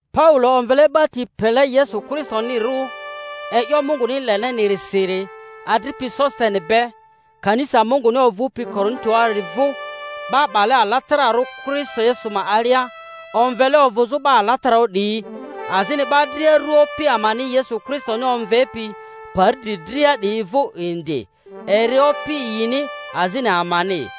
Paulo omvele 'ba ti pele Yesu Kristonirirᴜ e'yo Munguni lele-nirisiri, adripi Sositene be, Kanisa Munguni ovᴜpi Korinto-ari vᴜ, 'ba 'bale alatararᴜ Kristo Yesu ma alia, omvele ovᴜzᴜ 'ba alatararᴜ 'diyi, azini 'ba dria ru Opi amani Yesu Kristoni omvepi pari dri dria 'diyi vᴜ indi, eri Opi yini azini amani.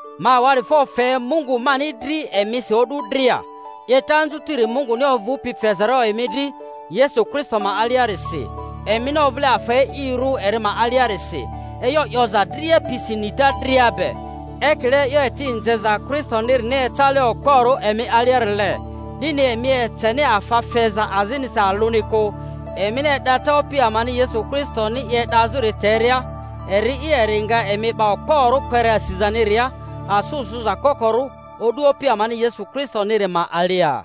Ma awa'difo fe Mungu mani dri emisi o'du dria, 'yeta anzutiri Munguni ovᴜpi fezarᴜ emi dri Yesu Kristo ma aliarisi, emini ovᴜle afa e'irᴜ eri ma aliarisi, e'yo 'yoza dria pisi nita dria be— ekile e'yo eti nzeza Kristonirini ecale okporᴜ emi aliarile— 'dini emi eceni afa feza azinisi alᴜni kᴜ, emini e'data Opi amani Yesu Kristoni i e'dazᴜri teria; eri'i, eri nga emi 'ba okporᴜ kpere asizaniria asᴜ sᴜza kokorᴜ o'du Opi amani Yesu Kristoniri ma alia.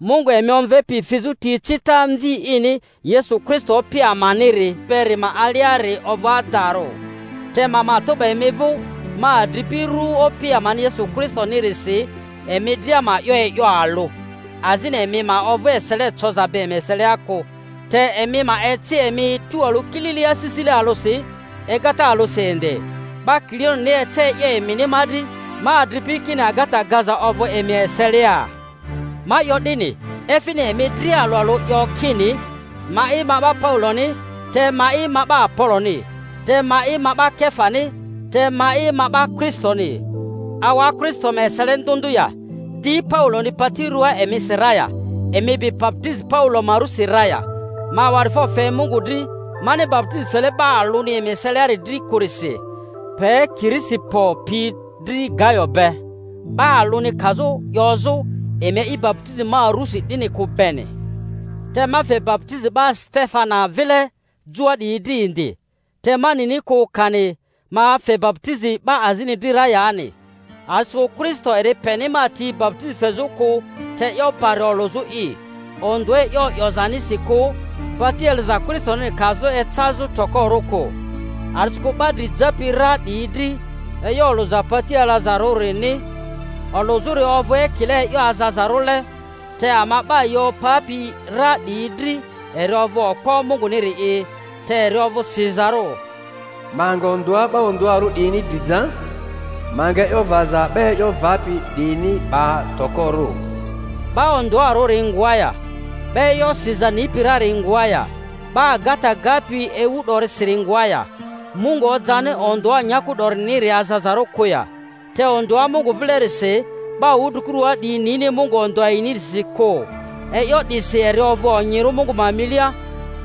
Mungu emi omvepi fizᴜ ti ecita Mvi ini Yesu Kristo Opi amaniri beri ma aliari ovᴜ adarᴜ. Te ma matᴜ 'ba emi vᴜ, ma adripi, ru Opi amani Yesu Kristoni-risi, emi dria ma 'yo e'yo alᴜ, azini emi ma ovᴜ esele coza be emi eselia kᴜ, te emi ma eci emi tualᴜ kilili asisile alᴜsi, egata alᴜsi indi. 'Ba Kiloeni ece e'yo emini ma dri, ma adripi, kini agata gaza ovᴜ emi eselia. Ma 'yo 'dini, efini emi dria alᴜ alᴜ 'yo kini, Ma'i ma 'ba Pauloni, te Ma'i ma 'ba Apoloni, te Ma'i ma 'ba Kefani, te Ma'i ma 'ba Kristoni. Awa Kristo ma esele ndᴜ ndᴜ ya? Di Pauloni pati ruaa emisi ra ya? Emi bi baputizi Paulo ma rusi ra ya? Ma awa'difo fe Mungu dri mani baputizi fele 'ba alᴜni emi eseliari dri kᴜrisi, pe Kirisipo pi dri Gayo be; 'ba alᴜni kazᴜ 'yozᴜ emi a'i baputizi ma rusi 'dini kᴜ beni. (Te ma fe baputizi 'ba Setefana vile joa 'diyi dri indi. Te ma nini kᴜ kani ma fe baputizi 'ba azini dri ra yani.) A'disikᴜ Kristo eri peni ma ti baputizi fezᴜ kᴜ te e'yo bari olᴜzᴜ'i, ondᴜa e'yo 'yozanisi kᴜ, pati alaza Kristoniri kazᴜ ecazᴜ tokorᴜ kᴜ. A'disikᴜ 'ba dri japi ra 'diyi dri e'yo olᴜza pati alazarᴜrini olᴜzᴜri ovᴜ ekile e'yo azazarᴜle, te ama 'ba yi opapi ra 'diyi dri eri ovᴜ okpo Munguniri'i. Te eri ovᴜ sizarᴜ, Ma nga ondᴜa 'ba ondᴜarᴜ 'diyini dri ja, ma nga e'yo vaza 'ba e'yo vapi 'diyini 'ba tokorᴜ. 'Ba ondᴜarᴜri ngoa ya? 'Ba e'yo siza nipi rari ngoa ya? 'Ba agata gapi ewu 'dorisiri ngoa ya? Mungu ojani ondᴜa nyaku 'doriniri azazarᴜ kᴜ ya? Te ondᴜa Mungu vilerisi 'ba wudrikurua 'diyi nini Mungu ondᴜa yinirisi kᴜ, e'yo 'disi eri ovᴜ onyirᴜ Mungu ma milia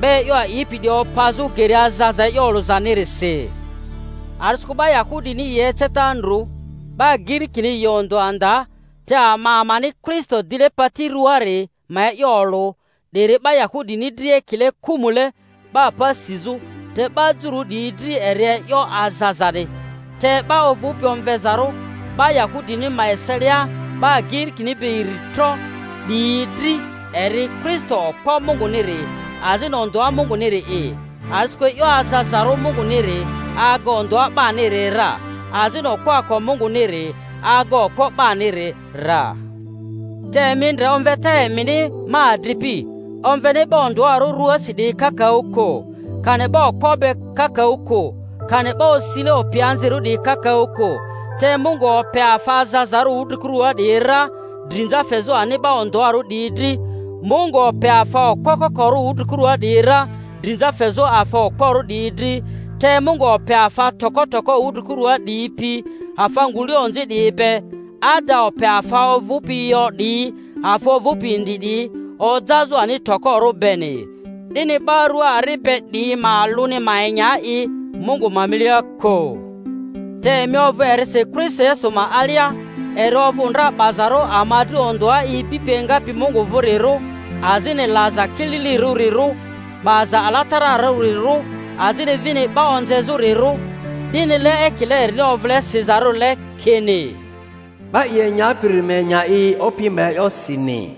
'ba e'yo a'ipi 'diyi opazᴜ geri azaza e'yo olᴜzanirisi. A'disikᴜ 'ba Yahudini yi eceta ndru, 'ba Girikini yi ondᴜa nda, te ama amani Kristo dile pati ruaari ma e'yo olᴜ, 'diri 'ba Yahudini dri ekile kᴜmᴜle 'ba pa sizᴜ, te 'ba jururᴜ 'diyi dri eri e'yo azazani, te 'ba ovᴜpi omvezarᴜ, 'ba Yahudini ma eselia 'ba Girikini be iri tro 'diyi dri, eri Kristo okpo Munguniri, azini ondᴜa Munguniri'i. A'disikᴜ e'yo azazarᴜ Munguniri aga ondᴜa 'baniri ra, azini okpoako Munguniri aga okpo 'baniri ra. Te emi ndre omveta emini, ma adripi; omveni 'ba ondᴜarᴜ ruasi 'diyi kakaᴜ kᴜ, kani 'ba okpo be kakaᴜ kᴜ, kani 'ba osile opianzirᴜ 'diyi kakaᴜ kᴜ; te Mungu ope afa azazarᴜ wudrikurᴜa 'diyi ra drinza fezᴜ ani 'ba ondᴜarᴜ 'diyi dri; Mungu ope afa okpo kokorᴜ wudri-kurua 'diyi ra, drinza fezᴜ afa okporᴜ 'diyi dri, te Mungu ope afa toko toko wudrikurua 'diyi pi afa ngule onzi 'diyi be, ada ope afa ovᴜpi yo 'diyi, afa ovᴜpi indi 'diyi ojazᴜ ani tokorᴜ beni, 'dini 'ba rua ari be 'diyi ma alᴜni ma enya i Mungu ma milia kᴜ. Te emi ovᴜ erisi Kristo Yesu ma alia, eri ovᴜ ndra 'bazarᴜ ama dri ondᴜa ibipi engapi Mungu vᴜrirᴜ, azini laza kililirᴜrirᴜ, 'baza alatararᴜrirᴜ, azini vini 'ba onzezᴜ-rirᴜ; 'dinile ekile erini ovᴜle sizarᴜrile kini, 'Ba i enyapiri ma enya i Opi ma e'yosini.